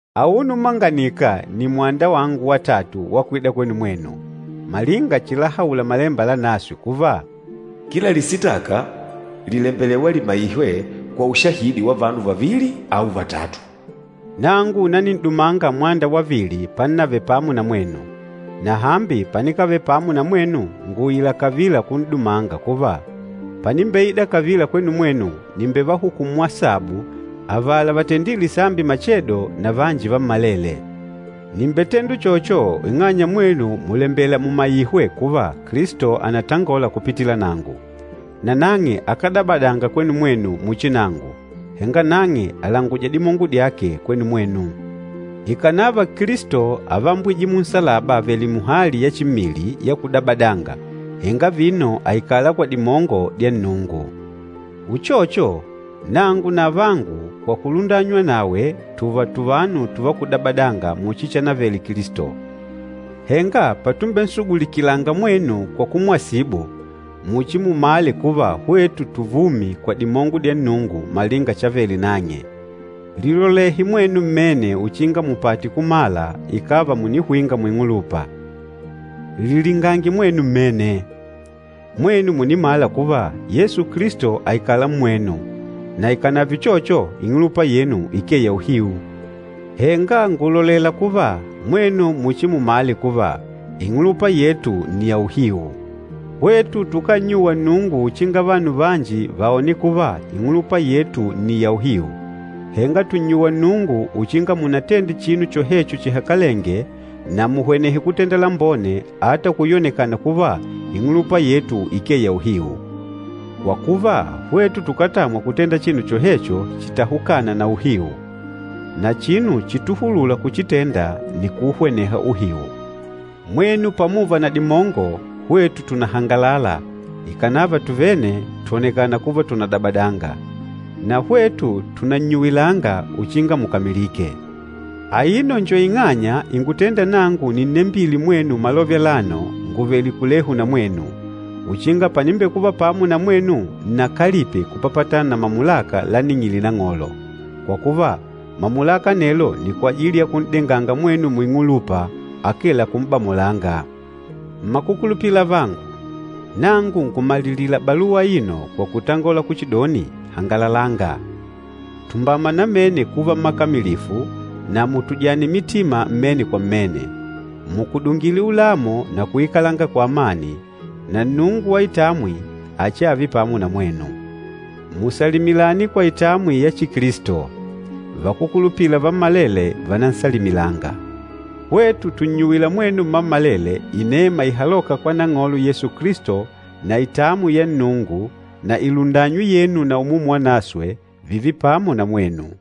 Auno umanganika nni mwanda wangu watatu wa kwida kwenu mwenu. Malinga chilahaula Malemba Lanaswe kuva, “Kila lisitaka lìlembelewa limaihwe kwa ushahidi wa vanu vavili au vatatu.” Nangu nanin'dumanga mwanda wavili pannavele pamo na mwenu. Na hambi panikavele pamo na mwenu ngùuila kavila kun'dumanga kuva, panimbeida kavila kwenu mwenu nìmbevahukumu asabu avala vatendîle sambi machedo na vanji vammalele. Nìmbetenda uchocho ing'anya mwenu mùlembela mumaihwe kuva Kilisto ànatangola kupitila nangu. Nanang'e akádabadanga kwenu mwenu muchi nangu, henga nang'e àlanguja dimongo dyake kwenu mwenu. Ikànava Kilisto ávambwije munsalaba avèlè muhali ya chimmili, ya kudabadanga, henga vino àikala kwa dimongo dya Nnungu. Uchocho, nangu na avangu, kwa kulundanywa nawe tùùva tuvanu tùvá kudabadanga muchi chanavele Kilisto. Henga patumbensugulikilanga mwenu kwa kumwasibu, muchimumale kuva hwetu tuvumi kwa dimongo dya Nnungu malinga chavele nang'e. Lilolehe mwenu mmene uchinga mupate kumala ikàva mùnihwinga muing'ulupa. Lilingange mwenu mmene. Mwenu mùnimala kuva Yesu Kilisto àikala mmwenu, na ikànave uchocho, ing'ulupa yenu ikee ya uhiu. Henga ngùlolela kuva, mwenu muchimumale kuva, ing'ulupa yetu nni ya uhiu. Hwetu tukánnyuwa Nnungu uchinga vanu vanji vaone kuva ing'ulupa yetu nni ya uhiu, henga tùnnyuwa Nnungu uchinga munatende chinu chohecho chihakalenge na muhwenehe kutenda lambone ata kuyonekana kuva ing'ulupa yetu ikee ya uhiu. Kwa kuva, hwetu tukátamwa kutenda chinu chohecho chitahukâna na uhiu. Na chinu chituhulûla kuchitenda nni kuuhweneha uhiu. Mwenu pamuva na dimongo, hwetu tùnahangalala ikànava tuvene twònekana kuva tùnadabadanga. Na hwetu tùnannyuwilanga uchinga mukamilike. Aino njo ing'anya ingutênda nangu ninnembile mwenu malove alano nguvèlè kulehu na mwenu, uchinga panimbekuva pamo na mwenu nnakalipe kupapatana na mamulaka láning'ìlè Nang'olo. Kwa kuva, mamulaka anelo nni kwajili ya kun'denganga mwenu muing'ulupa, akee la kum'bamolanga. Mmakukulupila avangu, nangu ngùmalilila baluwa aino kwa kutangola kuchidoni, hangalalanga. Tumbama namene kuva mmakamilifu na mutujane mitima mmene kwa mmene. Mukudungile ulamo na kuikalanga kwa amani, na Nnungu wa itamwi achiave pamo na mwenu. Musalimilane kwa itamwi ya Chikilisto. Vakúkulupila vammalele vànansalimilanga. Hwetu tùnnyuwila mwenu mmammalele inema ihalôka kwa Nang'olo Yesu Kilisto, na itamwi ya Nnungu na ilundanywi yenu na Umumu Wanaswe, vììve pamo na mwenu.